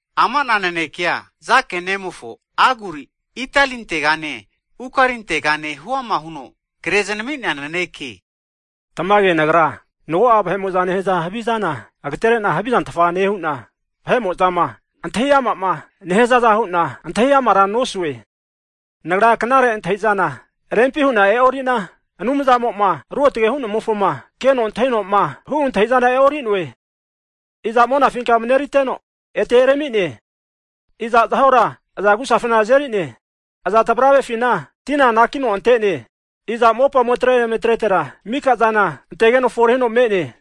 Ama'na nanekea, Jake nemofo, Aguri Itielintegane Ukalintega huama huno kre zanami'nea naneke. Tamage nagra mago'a vahe'mo'zama nehaza havizana agaterena havizantfa nehu'na, vahe'mozama antahi ama'ma nehazaza hu'na antahiamara nosue. Nagra knare antahizana rempi hu'na e'orina, Anumzamoma Ruotage hu'nemofoma keno antahinoma hu antahi'zana e'ori'noe. Iza monafinka mareriteno ete erami'ne? Iza zahora aza agu'safina azeri'ne? Iza tvarave'afina tina anakino ante'ne? Iza mopa ometre emetretera mikazana antegeno fore huno me'ne?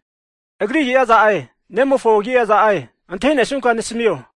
Agri agi'a iza'e, nemofo agi'a iza'e? Antahinesunka nasamio!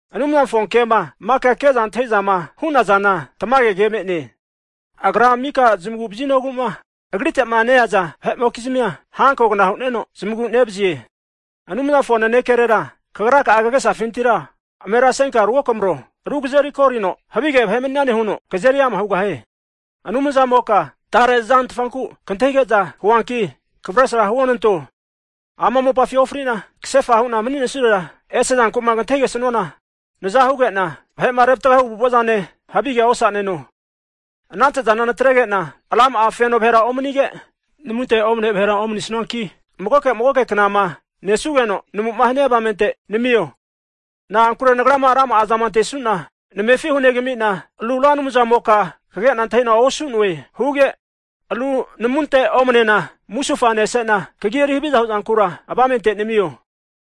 Anumzamofo kema maka ke'za antahizama hu'nazana tamage ke me'ne. Agra mika zamagu vazinoguma Agritema neaza vahe'mokizmia hankogna hu'neno zamagu nevazie. Anumzamofo nanekerera kagra'a kagesafintira amerasenka ruokamaro, ru kazeri korino havige vahe maninane huno kazeri ama hugahie. Anumzamoka tare zantfanku kantahige'za huanki kavresra huonanto, ama mopafi ofrina kasefa hu'na maninesurera, ese' zanku'ma kantahigesuana, nazahuge'na vahe'ma revatgahu avu'avazane havigea osaneno. Anante'zana natrege'na rama'a feno vahera omanige, namunte omane vahera omanisuanki magoke magoke knama nesugeno namuma hania avamente namio. Na'ankure nagrama rama'azama antesuna, namefi hunegamina ru Ra Anumzamoka kagena antahina osu'noe huge, ru namunte omanena musufa nesena, kagi eri haviza huzankura, avamente namio.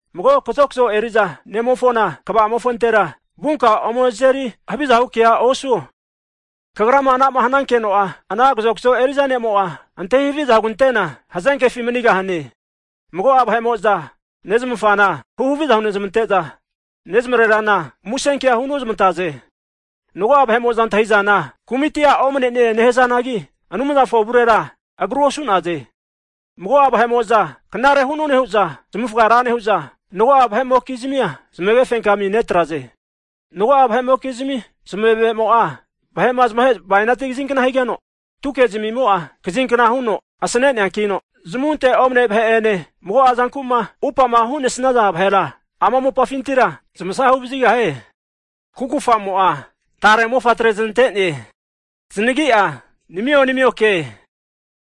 Mago kazokzo eriza nemofona kva'amofontera vunka ome azeri haviza hu kea osuo. Kagrama anama hnankeno'a, ana kazokzo eriza ne'mo'a antahi haviza hugantena, hazenkefi manigahane. Mago'a vahe'mo'za nezmafana hu haviza hunezamante'za, nezamrerana musenkea hunozmantaze. Mago'a vahe'mo'zama antahi'zana kumitia omne'ne nehazanagi, Anumzamofo avurera agrua osu'naze. Mago'a vahe'mo'za knare hu'none huza zamavufga ra nehu'za, mago'a vahe'mokizmia zmage fenkami netraze. Mago'a vahe'mokizmi zamavemo'a, vahe'ma zamahe bainati kazinkna higeno, tuke zmavemo'a kazinkna huno asaneneankino zamunte omane vahe ene, mago'a zanku'ma upama hu'nesnaza vahera, ama mopafintira zamasga huvazigahaze. Kukufamo'a taremofatre znante'ne. Zanagi'a, Namio, Namioke!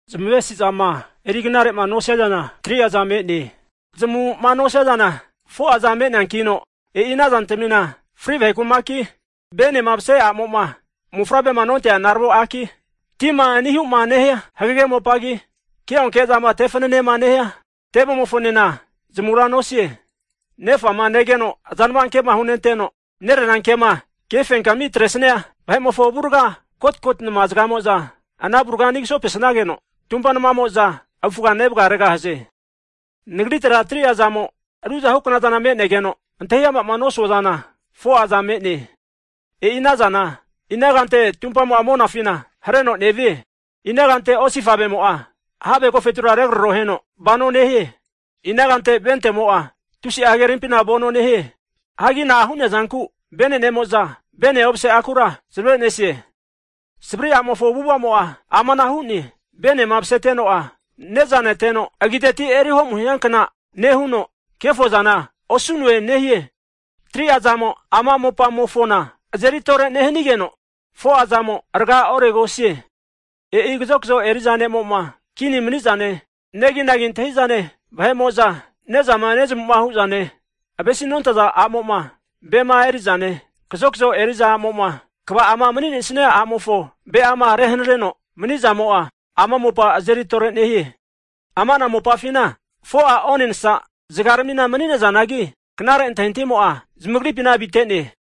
Zmavesizama eriknarema nosia zana 3'a za me'ne. Zmamuma nosia zana 4'a za me'neankino, e'i anazantamina, fri vahe kumaki, venema mase a'mo'ma mofavrema nontea naravo aki, tima anihuma nehia hagege mopagi, ke'onke zama tefananema nehia tevemofonena zamura nosie. Nefama negeno azanava kema hunenteno, nererama kefenkami atresnia vahe'mofo avurga, kotkoti nama zgamo'za ana avurga ani kasonepesageno, tumpa namamo'za avufga nevgaregahaze. Nagritera 3'a zamo ruzahukna zana megeno, antahi ama'ma nosua zana 4'a zana me'ne. E'i anazana ina kante tumpamo'a monafina hareno nevie, ina kante osifavemo'a have agofetura regraroheno vanoa nehie. Ina kante ventemo'a, tusi'a hagerimpina vano nehie. Hagi na'a hu'nea zanku venenemo'za, vene omase akura zamavenesie. Savri a'mofo avu'avamo'a amanahu hu'ne, venema maseteno'a, ne'za neteno agiteti eri ho'mu hiankna nehuno, kefo zana osu'noe nehie. 3'a zamo ama mopamofona azeri tore nehanigeno, 4'a zamo rga oregosie. E'i kazokzo eri'za ne'mo'ma kini mani'zane, neginagi antahizane vahe'mo'za nezama nezamuma hu'zane, ave'sinontaza a'mo'ma ve'ma eri'zane, kazokzo eri'za a'mo'ma kva'ama maninesia a'mofo ve'ama rehanareno manizamo'a, ama mopa azeri tore nehie. Ama'na mopafina 4'a onensa zgaramina mani'nazanagi, knare antintahimo'a, zamagripina avitene.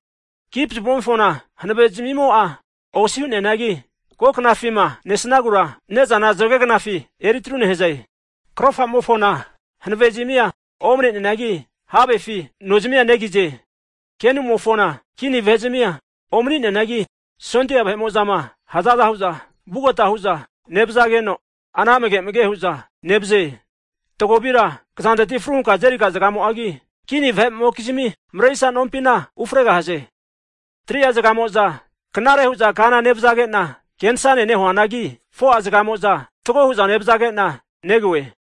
Kipzuvemofona hanave zmimo'a osi hu'neanagi, ko knafima nesagura ne'zana zgegnafi eritru nehaze. Krofamofona hanavezmia omne'neanagi, havefi nozmia negize. Kenumofona kini vahe'zamia omni'neanagi, sondia vahe'mo'zama hazaza hu'za, vugota huza nevazageno, ana amage amage hu'za nevaze. Tagovira kazanteti amne fru hunka azeriga zgamo'agi, kini vahe'mokizmi marerisa nompina ufregahaze. 3'a zgamo'za knare huza kana nevazagena kenasane nehuanagi, 4'a zgamoza fatgo hu'za nevazagena negoe.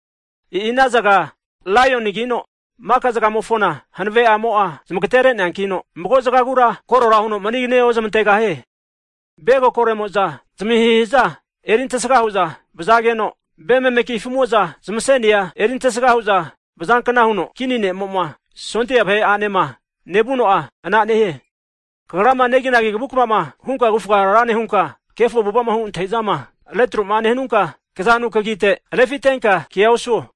E'i ana zga laionigino mika zgamofona hanave'amo'a zmagatere'neankino, mago zgagura korora huno manigane ozamantegahie. Ve kokoremoza zmahihiza eri antesga hu'za vazageno, ve memeki afumo'za zmasenia eri antesga hu'za vazankna huno, kini ne'mo'ma sondia vahe'anema nevuno'a, ana nehie. Kagrama neginagi kavukavama hunka kavufa ra nehunka, kefo avu'avama hu antahizama retro'ma nehanunka, kazanu kagite refintenka kea osuo.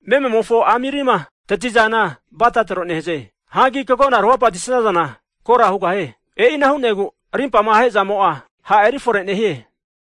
Mememofo amirima tatizana bata tronehaze. Hagi kagona ru hapati'sazana, kora hugahie. E'ina hu'negu arimpama ahezamo'a, ha' eri fore nehie.